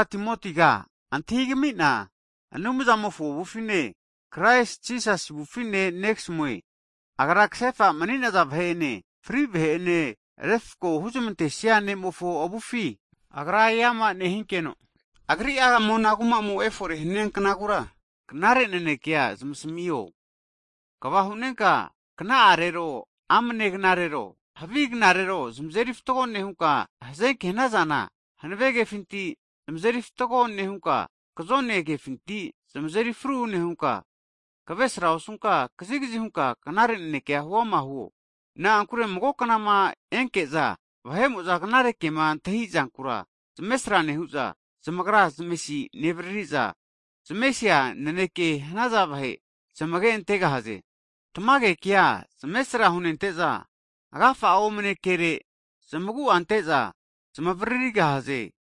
Timotiga Anumzamofo avufine, Kraisi Jisasima kasefa huza mani'naza vahe'ene, fri' vahe'ene refko huzmantesia ne'mofo avufi, Agra'ama eama nehinkeno, Agri'a mona kumamo efore hania knagura, knare nanekea huzamasmio, kva hu'nenka kna'arero amne knarero, havi knarera zamazeri fatgo nehunka, hazenke hanazana, hanave kefinti zamazeri fatgo nehunka, kzone kefinti zamazeri fru nehunka, kavesra osunka kazigzi hunka knare naneke huama huo. Na'ankure mago knama enke'za vahe'mo'za knare kema antahizankura zamesra nehu'za, zamagra zamesiza nevariri'za zamesisia nanekema hanaza vahe zamage antegahaze. Tamage kea zamesra hunente'za agafa'a omne kere zamagu'a ante'za zamavririgahaze.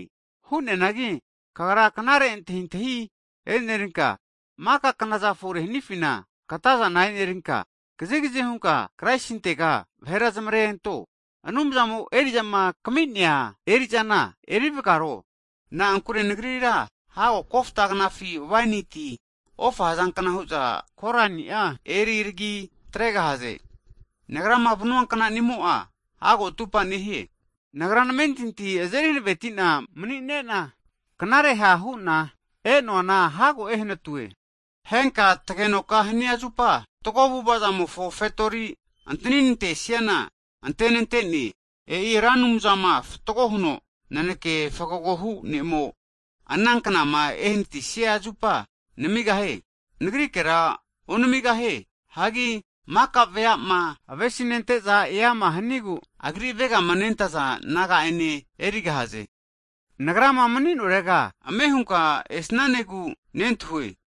Hu'neanagi kagra knare antahintahi e'nerinka, maka knaza fore hanifina katazana e'nerinka, kazigzi hunka Kraisintega vahera zamare anto, Anumzamo eri'zama kami'nea erizana erivgaro. Na'ankure nagrira hago kofta knafi, waini ti ofa hazankna hu'za korani'a eri tagi atregahaze. Nagrama vanua knani'mo'a hago atupa nehie. Nagra namentinti'a azeri hanavetina mani'nena, knare ha' hu'na nagiama re'na e'noana hago ehnatue. Henka tagenoka hania zupa, fatgo avu'avazamofo kini fetori antani nantesiana antenante'ne. E'i Ra Anumzama fatgo huno naneke fgagohu ne'mo, ana knama ehnatisia zupa namigahie, nagrikera onmigahie. Hagi maka veama avesi nente'za eama hanigu Agri avegamanentaza nagamozane erigahaze. Nagrama mni'norega ame'hunka esnanegu nentahue.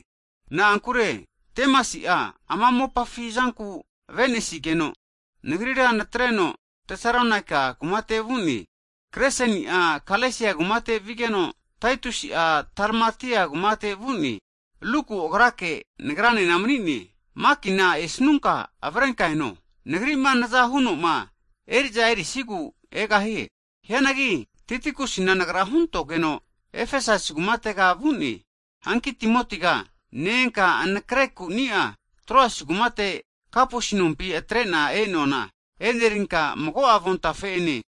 Na'ankure Demasi'a, ama mopafi zanku avenesigeno, nagrira natreno Tesalonaika kumate vu'ne. Kreseni'a Galesia kumate vigeno, Taitusi'a Dalmatia kumatega vu'ne. Luku agrake nagranena mani'ne. Makina esnunka avrenka eno, nagri'ma naza hunoma eri'za erisigu egahie. Hianagi Tikikusina nagra huntogeno Efesasi kumatega vu'ne. Hanki Timotiga ne-enka anakre ku'nia Troas kumate Kapusi nompi atre'na e'noana e'nerinka, mago'a avontafe'ene,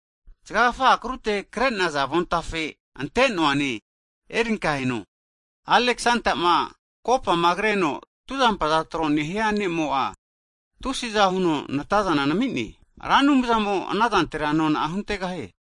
zgagfa akrute kre'naza avontafe ante'noane erinka eno. Alexandama kopama kreno tuzampaza tro nehia ne'mo'a, tusiza huno natazana nami'ne. Ra Anumzamo anazantera nona'a huntegahie.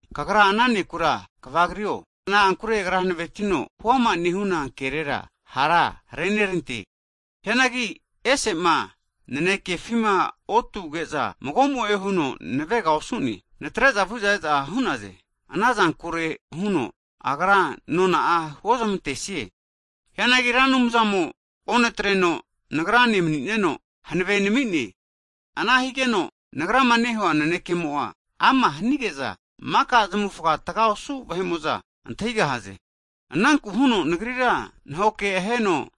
Kagra ana ne'kura kvagrio, na'ankure agra hanavetino huama nehuna kerera hara renerante. Hianagi ese'ma nanekefima otuge'za magomo'e huno navega osu'ne, natre'za vu'za e'za hu'naze, ana zankure huno Agra nona'a huozmantesie. Hianagi Ra Anumzamo onatreno nagrane mani'neno hanave nami'ne, ana higeno nagrama nehua nanekemo'a ama hnige'za, maka zamufga tga osu vahe'mo'za antahigahaze. Ananku huno nagrira nahoke aheno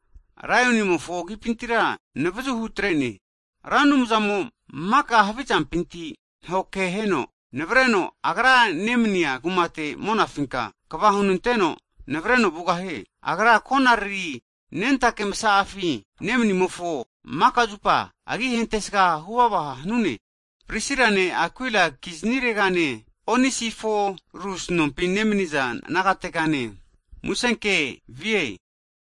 laionimofo agipintira navzu hutre'ne. Ra Anumzamo maka havizampinti nahoke heno nenavreno, Agra nemnia kumate monafinka kva hunanteno navreno vugahie. Agra konariri nentake msa'afi nemnimofo agi'a maka zupa hentesga huvava hanune. Tmage. Prisilane Akuila kizniregane, Onesiforus nompi nemniza nagategane musenke vie.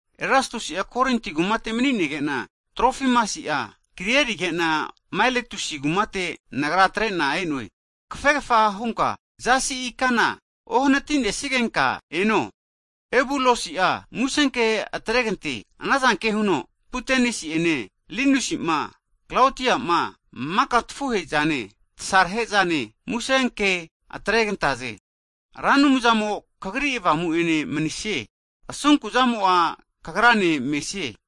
Erastusi'a Korinti kumate manige'na, Trofimasi'a kri erige'na Maeletus kumate nagra atre'na e'noe. Kafegfa hunka zasi ikana ohnati'nesigenka eno. Ebulusi'a musenke atregante, anazanke huno Pudensi'ene, Linusi'ma, Klaudia'ma, maka tafuhe'zane, tsarahe'zane muse ke atregantaze. Ra Anumzamo kagri avamu'ene manisie. Asunku'zamo'a kagrane mesie.